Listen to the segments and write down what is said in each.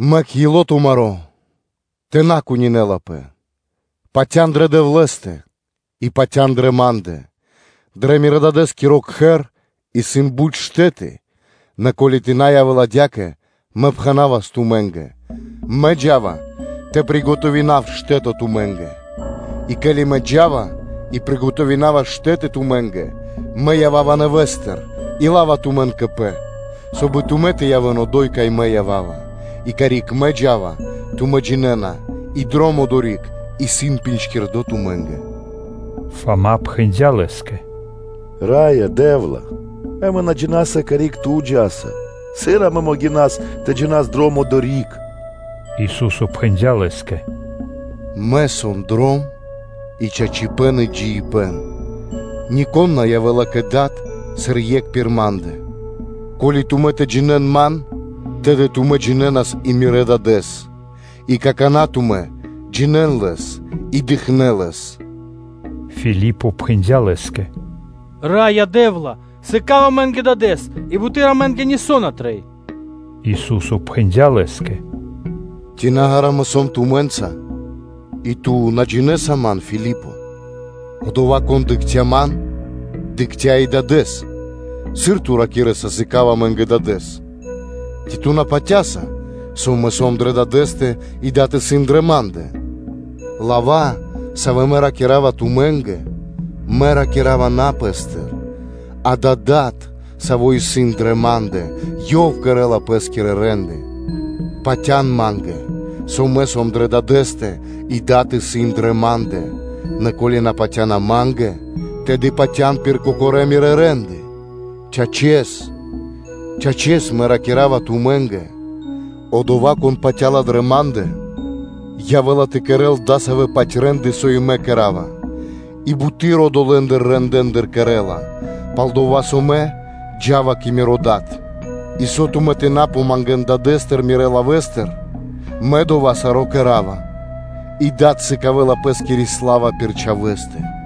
“Мэк ило́ тумаро́ тэ на страхадёл; патя́н дрэ Дэвлэ́стэ и патя́н дрэ Ма́ндэ. Дрэ Мирэ́-Дадэ́скиро кхэр исын бут штэ́ты; нэ ко́ли тэ на явэ́л адя́кэ, Мэ пхэнавас тумэ́нгэ: Мэ джа́ва тэ кэдав штэ́то тумэ́нгэ?” И ке́ли Мэ джа́ва и кэдава штэ́то тумэ́нгэ, Мэ ява́ва нэвэ́стыр и лава́ тумэн кэ Пэ; соб (кай) и тумэ́ тэ явэ́н одо́й, кай Мэ ява́ва. А карик Мэ джа́ва, тумэ́ джинэ́на и дром одори́к исын джиндло́ тумэ́нгэ.” Фама пхэндя́ Лэ́скэ: “Раё Дэ́вла! Амэ на джина́са, карик Ту джа́са; сыр амэ могинаса тэ джинас дром одори́к?” Ису́со пхэндя́ лэ́скэ: “Мэ сом дром и чачипэ́н и джиибэ́н; нико́н на явэ́ла кэ Дад, сыр екх пир Ма́ндэ. Ко́ли тумэ́ тэ джинэ́н Ман, тэды тумэ́ джинэнас и Мирэ́ Дадэ́с; и какана́ тумэ́ джинэ́на Лэс и дыкхнэ́ Лэс.” Филипо пхэндя́ Лэ́скэ: “Раё Дэ́вла! Сыка́в амэ́нгэ Дадэ́с, и буты́р амэ́нгэ нисо́ на трэй.” Ису́со пхэндя́ лэ́скэ: “Ци на ґара́” (длу́гэс) Мэ сом тумэ́нца, и ту на джинэ́са Ман, Филипо? Одова́, кон дыкхця́ Ман, дыкхця́ и Дадэ́с; сыр ту ракирэ́са: ‘Сыка́в амэ́нгэ Дадэ́с?’ Ци ту на патя́са, со Мэ сом дрэ Дадэ́стэ и Дад исын дрэ Ма́ндэ? Лава́, савэ́ Мэ ракира́ва тумэ́нгэ, Мэ ракира́ва на Пэ́стыр; адава́ Дад, Саво́ исын дрэ Ма́ндэ, Ёв кэрэ́ла Пэ́скирэ рэ́нды. Патя́н Ма́нгэ, со Мэ сом дрэ Дадэ́стэ и Дад исын дрэ Ма́ндэ; нэ ко́ли на патя́на Ма́нгэ, тэды патя́н пир кокорэ́ Мирэ́ рэ́нды. Чачэс, чачэс Мэ ракира́ва тумэ́нгэ: Одова́, кон патя́ла дрэ Ма́ндэ, явэ́ла тэ кэрэ́л дасавэ́-паць рэ́нды, со и Мэ кэра́ва и буты́р одолэ́ рэндэ́ндыр ёв кэрэ́ла; пал-дова́ со Мэ джа́ва кэ Миро Дад. И со тумэ́ тэ на помангэн Дадэ́стыр Мирэ́ лавэ́стыр, Мэ саро́ кэра́ва дова́, и Дад сыкавэ́ла Пэ́скири сла́ва пир Чхавэ́стэ.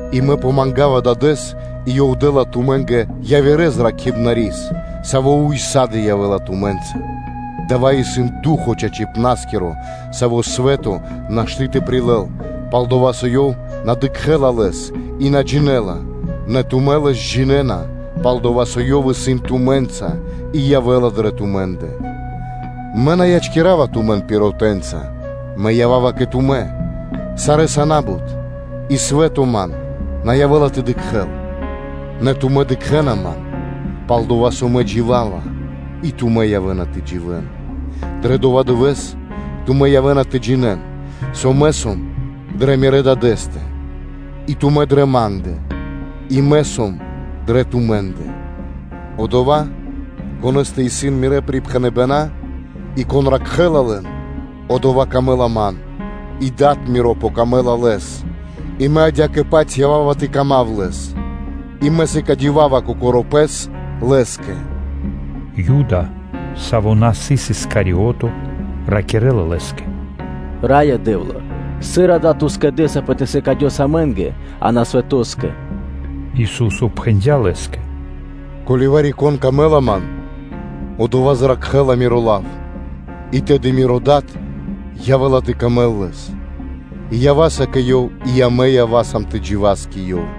И Мэ помангава Дадэ́с, и Ёв дэ́ла тумэ́нгэ явирэ Обрадыпна́скирэс (Утешытелёс), саво́ ўса́ды (сак) явэ́ла тумэ́нца; дава́ исын Ду́хо (Фа́но) чачипна́скиро, Савэс свэ́то нашты́ тэ прилэл, пал-дова́ со ёв на дыкхэ́ла Лэс и на джинэ́ла; нэ тумэ́ Лэс джинэ́на, пал-дова́ со Ёв исын тумэ́нца и явэ́ла дрэ тумэ́ндэ. Мэ на ячкирава тумэн пиротэнца (сиротэнца), Мэ ява́ва кэ тумэ́. Сарэ́са на́бут, и свэ́то Ман на явэ́ла тэ дыкхэ́л, нэ тумэ́ дыкхэ́на Ман, пал-дова́ со Мэ джива́ва, и тумэ́ явэ́на тэ дживэ́н. Дрэ дова́ дывэ́с тумэ́ явэ́на тэ джинэ́н, со Мэ сом дрэ Мирэ́ Дадэ́стэ, и тумэ́ сан дрэ Ма́ндэ, и Мэ сом дрэ тумэ́ндэ. Одова́, конэ́стэ исын Мирэ́ припхэныбэна́, и кон ракхэ́ла лэн, одова́ рикирэ́ла Ман сыр Дро́гима дро ило́, и Дад Миро сыкавэ́ла паты́в лэ́скэ, и Мэ адя́кэ-паць ява́ва тэ сыкавав паты́в лэ́скэ, и Мэ сыкадёвава Кокоро́ Пэс лэ́скэ.” Юда, саво́ на сыс Искариото, ракирэ́ла Лэ́скэ: “Раё Дэ́вла! Сыр да Ту скэдэсапэ тэ сыкадёс амэ́нгэ, а на свэтоскэ?” Ису́со отпхэндя́ лэ́скэ: “Ко́ли вари-конэ́скэ сом дро́го Мэ, одова́ ману́ш зракхэ́ла Миро лав; и тэды Мирэ́ Дадэ́скэ явэ́ла дро́го ёв, и амэ ява́са кэ ёв и амэ ява́са тэ джива́с кэ ёв.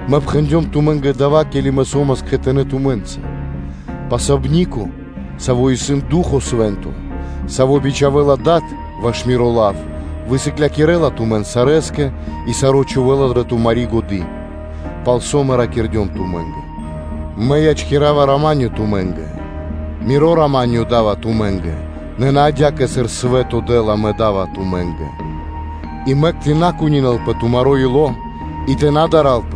Мэ пхэндём тумэ́нгэ дава́, ке́ли Мэ со́мас кхэтанэ́ тумэ́нца. Обрадыпнаскиро, Саво́ исын Ду́хо (Фа́но) Свэ́нто, Саво́ бичхавэ́ла Дад ваш Миро лав, высыклякирэла тумэн сарэскэ и саро́ чхувэ́ла дрэ тумари́ годы́, пал со Мэ ракирдём тумэ́нгэ. Мэ ячкирава рама́нё (миро) тумэ́нгэ, Миро рама́нё Мэ да́ва тумэ́нгэ: нэ на адя́кэ, сыр свэ́то дэ́ла, Мэ да́ва тумэ́нгэ, и мэк тэ на страхадёл тумаро́ ило́, и тэ на дарэл.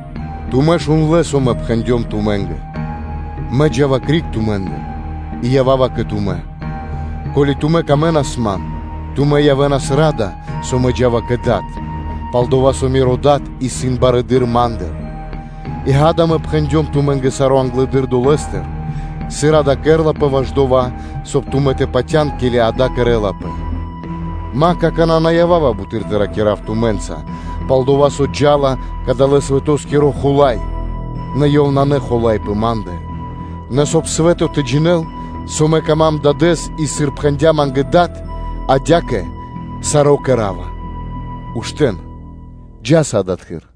Тумэ́ шундлэ́, со Мэ пхэндём тумэ́нгэ: ‘Мэ джа́ва криг тумэ́ндыр и ява́ва кэ тумэ́. Ко́ли тумэ́нгэ Мэ явавас дро́го, тумэ́ явэ́нас ра́да, со Мэ джа́ва кэ Дад; пал-дова́ со Миро Дад исын барэды́р Ма́ндыр’. И, ґа́да, Мэ пхэндём тумэ́нгэ саро́ англэды́р долэ́стыр, сыр дава́ кэрэ́лапэ ваш дова́, соб (кай) тумэ́ тэ патя́н, ке́ли дава́ кэрэ́лапэ. Мэ какана́ на ява́ва бут тэ ракира́в тумэ́нца, пал-дова́ со джа́ла далэ́-свэтоскиро хула́й, нэ ёв исын на хула́й пэ Ма́ндэ. Нэ, соб (кай) свэ́то тэ джинэ́л, со Ма́нгэ исын дро́го Дад и, сыр пхэндя́ Ма́нгэ Дад, адя́кэ Мэ саро́ кэра́ва: ‘Уштэ́н, джа́са адатхы́р.’”